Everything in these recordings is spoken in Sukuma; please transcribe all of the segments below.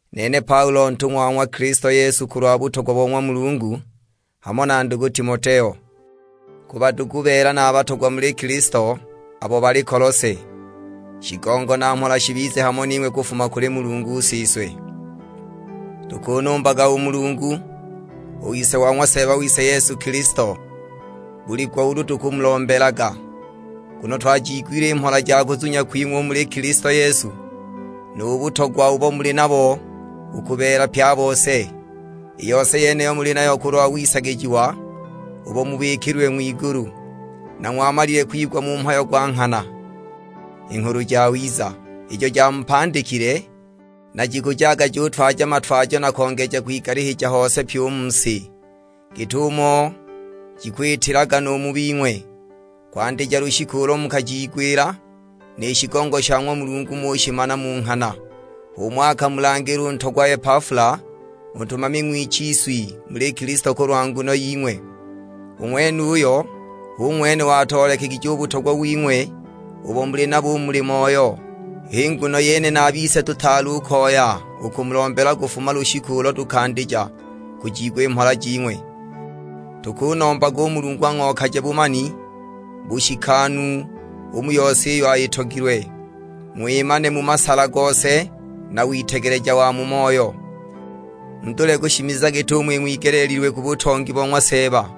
Nene Paulo ntung'wa wa ng'wa Kilisto Yesu kulwa butogwa bo ng'wa Mulungu, hamo na ndugu Timoteo. Ku badugu beela na batogwa muli Kilisto, abo bali Kolose. Shigongo na mhola shibize hamo ning'we kufuma kuli Mulungu Siswe. Tukunumbaga u Mulungu, u Ise wa ng'wa Seeba wise Yesu Kilisto, buli gwa ulu tukumulombelaga. Nguno twajiigwile i mhola ja kuzunya kwing'we u muli Kilisto Yesu, nu butogwa ubo muli nabo u ku beela pye a bose. I yose yeniyo muli nayo kulwa wisagijiwa ubo mubikililwe ng'wigulu, na ng'wamalile kuwigwa mu mhayo gwa nghana; i Nghulu Jawiza, ijo jamupandikile, na jikujaga jutwaja matwajo na kongeja kwigalihija hose pyi u mu si, git'umo jikwitilaga nu mu bing'we, kwandija lushiku ulo mukajiigwila, ni shigongo sha ng'wa Mulungu ng'ushimana mu nghana. H'umo akamulangila nu ntogwa Epafula, u ntumami ng'wichiswi muli Kilisto kulwa nguno ying'we. U ng'wenuyo hu ng'wene watoolekegije u butogwa wing'we ubo muli nabo u muli Moyo. H'i nguno yene na a bise tutaali u koya u kumulombela kufuma lushiku ulo tukandija kujiigwa i mhola jing'we. Tukunombaga u Mulungu ang'okaje bumani bushikanu u mu yose iyo ayitogilwe, ng'wimane mu masala gose na witegeleja wa mu moyo. Mudule kushimiza git'umo ing'wigeleelilwe ku butongi bo ng'wa Seeba,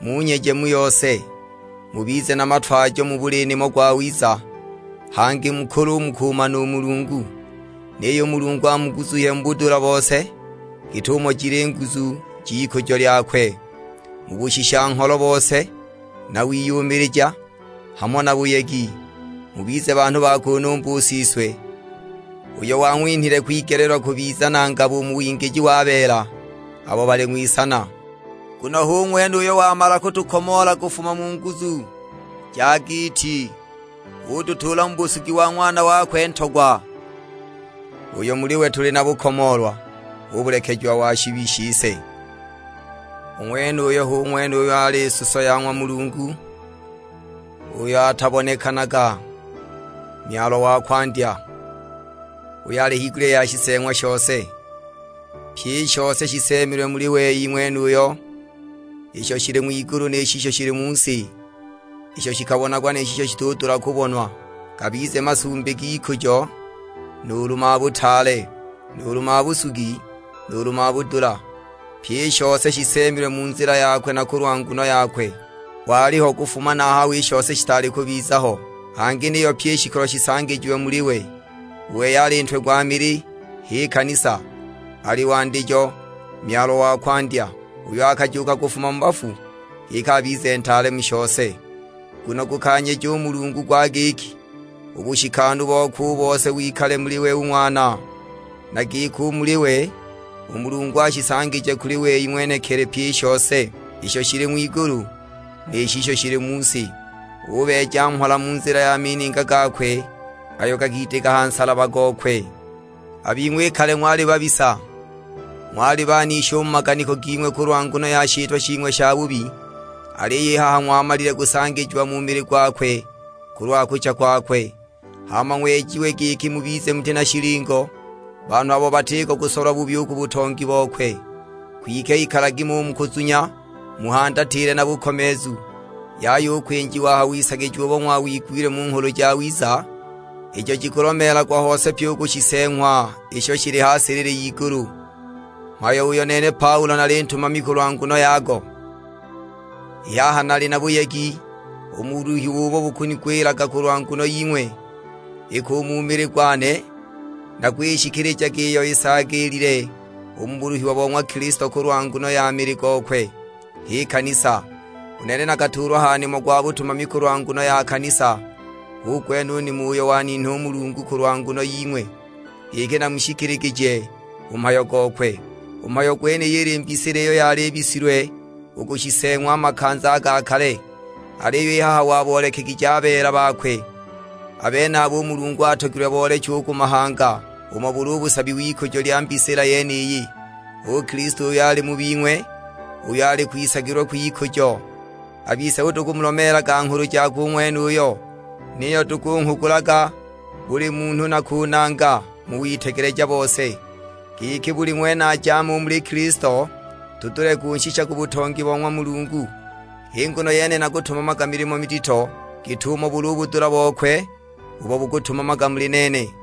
munyeje mu yose, mubize na matwajo mu buli nimo gwawiza; hangi mukule u mu kumana u Mulungu. Niyo u Mulungu amuguzuhye mu budula bose, git'umo jili i nguzu j'ikujo lyakwe, mu bushisha-ngholo bose, na wiyumilija, hamo na buyegi. Mubize banhu ba kunumba u Siswe, uyo wang'winhile kwigeleelwa kubiza na ngabo u mu wingiji wa beela abo bali ng'wisana. Nguno hu ng'wene uyo wamala kutukomoola kufuma mu nguzu ja giiti, ututuula mu busugi wa Ng'wana wakwe Ntogwa, uyo muli we tuli na bukomoolwa; hu bulekejiwa wa shibi shise. U ng'wenuyo hu ng'wene uyo ali suso ya ng'wa Mulungu uyo atabonekanaga, Myalwa wa kwandya, uyo ali higulya ya shiseeng'wa shose. Pye i shose shiseemilwe muli we u ng'wenuyo, isho shili ng'wigulu ni shisho shili mu si, isho shikabonagwa ni shisho shitudula kubonwa, gabize masumbi g'ikujo, nuulu mabutaale, nuulu mabusugi, nuulu mabudula; pyi i shose shiseemilwe mu nzila yakwe na kulwa nguno yakwe. Waliho kufuma na a haho i shose shitaali kubiza ho; hangi niyo pyi i shikolo shisangijiwe muli we. U wei ali Ntwe gwa mili, h'i kanisa. Ali wandijo, Myalwa wa kwandya, uyo akajuuka kufuma mu bafu, giki abize ntaale mu shose. Nguno gukanyeja u Mulungu gwa giki, u bushikanu bokwe u bose wikale muli we u Ng'wana. Na giki u muli we, u Mulungu ashisangije kuli wei ng'wenekili pyi i shose: isho shili ng'wigulu, ni shisho shili mu si. Ubeeja mhola mu nzila ya mininga gakwe ayo gakidika ha nsalaba gokwe. A bing'we i kale ng'wali babisa, ng'wali banishi u mu maganiko ging'we kulwa nguno ya shitwa shing'we shabubi! Aliyo i haha ng'wamalile kusangijiwa mu mili gwakwe kulwa kucha kwakwe, hama ng'wejiwe giki mubize muti na shilingo, banhu abo batiko kusolwa bubi ku butongi bokwe. Kwike ikalagi mo u mu kuzunya muhandatile na bukomeezu, yaya u kwinjiwa a ha wisagijiwa ubo ng'wawigwile mu Nghulu Jawiza, ijo jikulomeelagwa hose pye u ku shiseeng'wa isho shili ha silili y'igulu; mhayo uyo nene Paulo nali ntumami kulwa nguno yago. I haha nali na buyegi u mu buluhiwa ubo bukunigwilaga kulwa nguno ying'we; iki u mu mili gwane nakwishikilijaga iyo isaagiilile u mu buluhiwa bo ng'wa Kilisto kulwa nguno ya mili gokwe, h'i kanisa. U nene nakatuulwa ha nimo gwa butumami kulwa nguno ya kanisa, hu gwene u nimo uyo waninha u Mulungu kulwa nguno ying'we; giki namushikiligije u mhayo gokwe. U mhayo gwenuyu ili mbisila iyo yali ibisilwe u ku shiseeng'wa a makanza a ga kale. Aliyo i haha waboolekegije a beela bakwe. A benabo u Mulungu atogilwe booleche u ku mahanga umo buli u busabi w'ikujo lya mbisila yeniyi, hu Kilisto uyo ali mu bing'we, uyo ali kwisagilwa kw'ikujo. A bise hu tukumulomeelaga nghulu jakwe u ng'wenuyo; niyo tukunghugulaga buli munhu na kunanga mu witegeleja bose, giki buli ng'wene ajaame u muli Kilisto, tudule kunshisha ku butongi bo ng'wa Mulungu. H'i nguno yene nakutumamaga milimo midito git'umo buli u budula bokwe ubo bukutumamaga muli nene.